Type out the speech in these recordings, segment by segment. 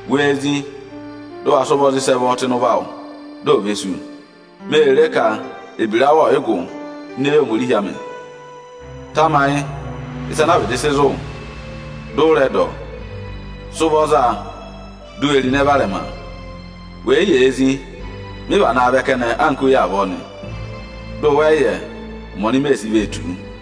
Wee zí, dị ụ wa sị ụvọ za ịsị ẹ vọ tụ́ ịnị ụvọ awụ nịnị dị ò ve sú! Ọ kà Oni ô re ka ebira awụ nịnị ọọ̀ yị gụ ini eyi Ohomorihi anị. Tamayị ịsa ana a vịdị sị zụ̀ wụ nịnị, dị ụ rẹ dọ ọ. Sị ụvọ za a nịnị, di u we ro ịnẹ varẹma. Wè yi yee zí nịnị, mị vanaa vẹ kẹnẹ anka oyi avọọ nị, dị ụ wẹ yị yẹ ụmẹ ọnị mee sii vee tù wu nịnị nị.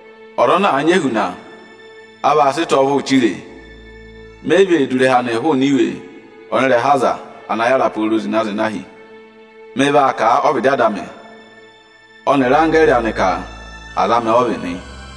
Ọza ana àa nyị ehuna, a vaa sị ịta ọvụụ chiree. Me yi vee du ịrẹha anịị hụụnị iwe ọnị ịrẹha aza ana yàra pooro zịna-zịna hi. Mị vaa kà a ọ́vịdị Ada amị ọnịrị anggẹẹrị anị ka aza amị ọ vị nị.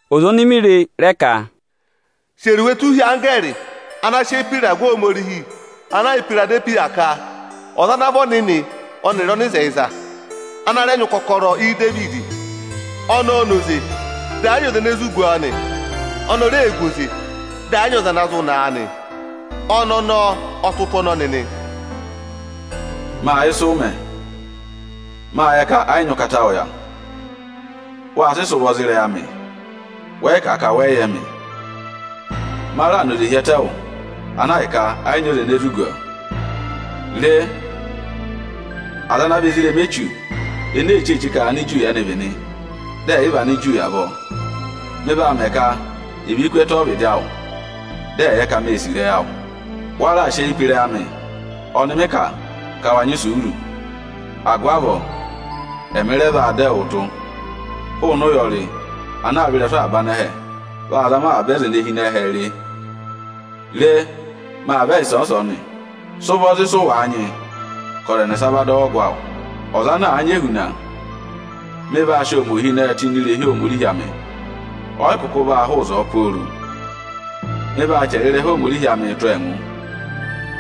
Ọza oni mi re rẹ ka: Chẹrẹ iwe tụ́ hi anggẹẹrị ana sị eyi pe ịragụ Ohomorihi ana yà Ihwiradehwiya ka: Ọza ana vị ọnịnị ọnịrị ọnịzẹyịza, ana rẹ nyị ụkọkọrọ Idevidi; ọnị ọọ̄ na oze, dị ẹ yị nyị ọza ene zụ gu ọọ nị; oni o reē gu oze, dị ẹ yị nyị ọza ana zụ naa nị; ọnị ọnọọ ọ tụ́ ụtụ ọnọnị nị: Máa yẹ ịsụ ụ mẹ. Máa yẹ ka ẹ yị nyị ụkata awụ yà. Wa sị sị ụvọ za ịrẹyị amị, wẹ yị kà a ka wẹ yị yẹ mị. Ma raà na oze hi ẹtẹ wụ, ana ahịka ẹ yị nyị ọza ene zụ gu ọọ. Re, aza ana vị ezirẹma Echu ene ee cheeche ka Aniju ẹ́nị vị nị, dị ẹ̀yị vị Aniju avọọ, mị vaa mẹ ka è ve ku ẹtẹ ọ́vịdị awụ, dị ẹ̀ yẹ ka mée sì ịrẹyị awụ. Wa raà sị eyi pe ịrẹyị amị ọnị mị kà ka wa nyị isuuru; agụvị avọọ ẹmị rẹ vaa dọ ẹwụụ tụ́ụ hụụnị ụyọrị ana aa vẹ ịrẹsụ avaba anẹhẹ vaa zama avaba aza ene hi ịnị ẹhẹẹ re. Re, maa vẹ ịsọọnị-ịsọọnị. Sị ụvọ za ịsụ wàa nyị ka ọza ẹnẹsa va dọ wụ ọgụ awụ! Ọza ana àa nyị ehuna, mị vaa sị ọọ mẹ ohinẹẹ tụ́ ini irehi Ohomorihi amị, ọyị kụkụ vaa hụụ ịzọọ pooro. Mị vaa chẹrẹ ịrẹha Ohomorihi amịị tụ́ ọọ ẹngụ,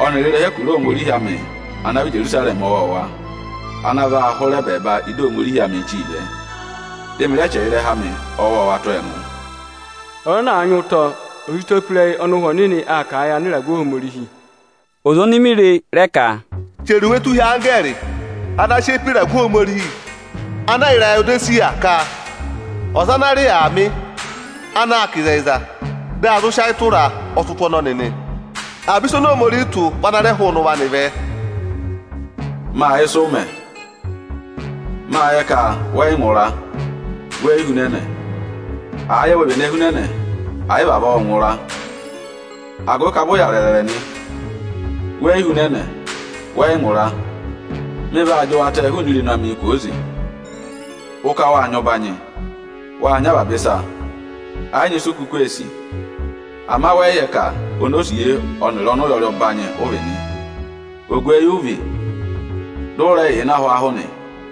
ọnịrị ịrẹha ẹkụra Ohomorihi amị ana vị Ijerusarẹmị ọwọọwa ana vaa hụrẹ ẹbẹẹba ịda Ohomorihi amịị chíi vẹ. Dị mị rẹ chẹrẹ ịrẹha amị ọwọọwa tụ́ ọọ ẹngụ. Ọza ana àa nyị ụtọ, ọ̀ sị ụtọ pe ịrẹyị ọnị Ụhwẹ Ọnịnị aa kà a yị anịragụ Ohomorihi. Ọza oni mi re rẹ ka: Chẹrẹ iwe tụ́ hi anggẹẹrị ana sị eyi pe ịragụ Ohomorihi ana yà Irayodesiya ka: Ọza ana rị Aamị, anaā kà ịzẹyịza, dị a zụ sị ayị tụraa, ọ tụ́ ụtụ ọnọnị nị; avaba ịsa oni Ohomorihi tụ́ vị ana rẹ hụụnị ụvọ anị vẹ: Máa yẹ ịsụ ụ mẹ. Máa yẹ ka wẹ yị ngụra, weyi hunẹnẹ. Àa yẹ we véné hunẹnẹ, àyị vị avọọ ụ ngụra! Agụvị ka vụ ụ yà rẹrẹrẹ nị, weyi hunẹnẹ, wẹ yị ngụra, mị vaa jị wụ atẹẹ hụụnị irenu amị kwooze. Ụ ka wáa nyị ụbanyị, wáa nyị avaba ịsa, ẹ yị nyị isu u kuku ee sì. Ama wẹ yị yẹ ka onosiye ọnịrị ọnụyọrị ọbanyị ụ vị nị. Ogweyi ụ vị, dị ụ rẹ yà ịnị ahwaahụ nị.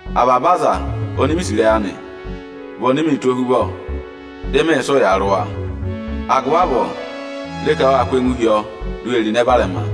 Avaba aza oni mi sì ịrẹyị anị vị oni miī tụ́ ohuvọ, dị mị sị ụya rị wa. Agụvị avọọ re ka wáa kụ́ ẹngụ hi ọọ, di u we ro ịnẹ varẹma.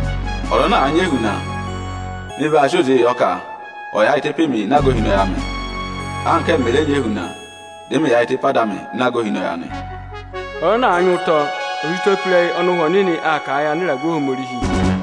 Ọza ana àa nyị ehuna, mị vaa sị oze yọ ka ọ̀ yaayịtẹ pe mi ịnị aga ohinọyị amị, anka ẹ́mị mẹ̀ rẹ nyị ehuna, dị mị yaayịtẹ pe Ada amị ịnị aga ohinọyị anị. Ọza ana àa nyị ụtọ, ọ̀ sị ụtọ pe ịrẹyị ọnị Ụhwẹ Ọnịnị aa kà a yị anịragụ Ohomorihi!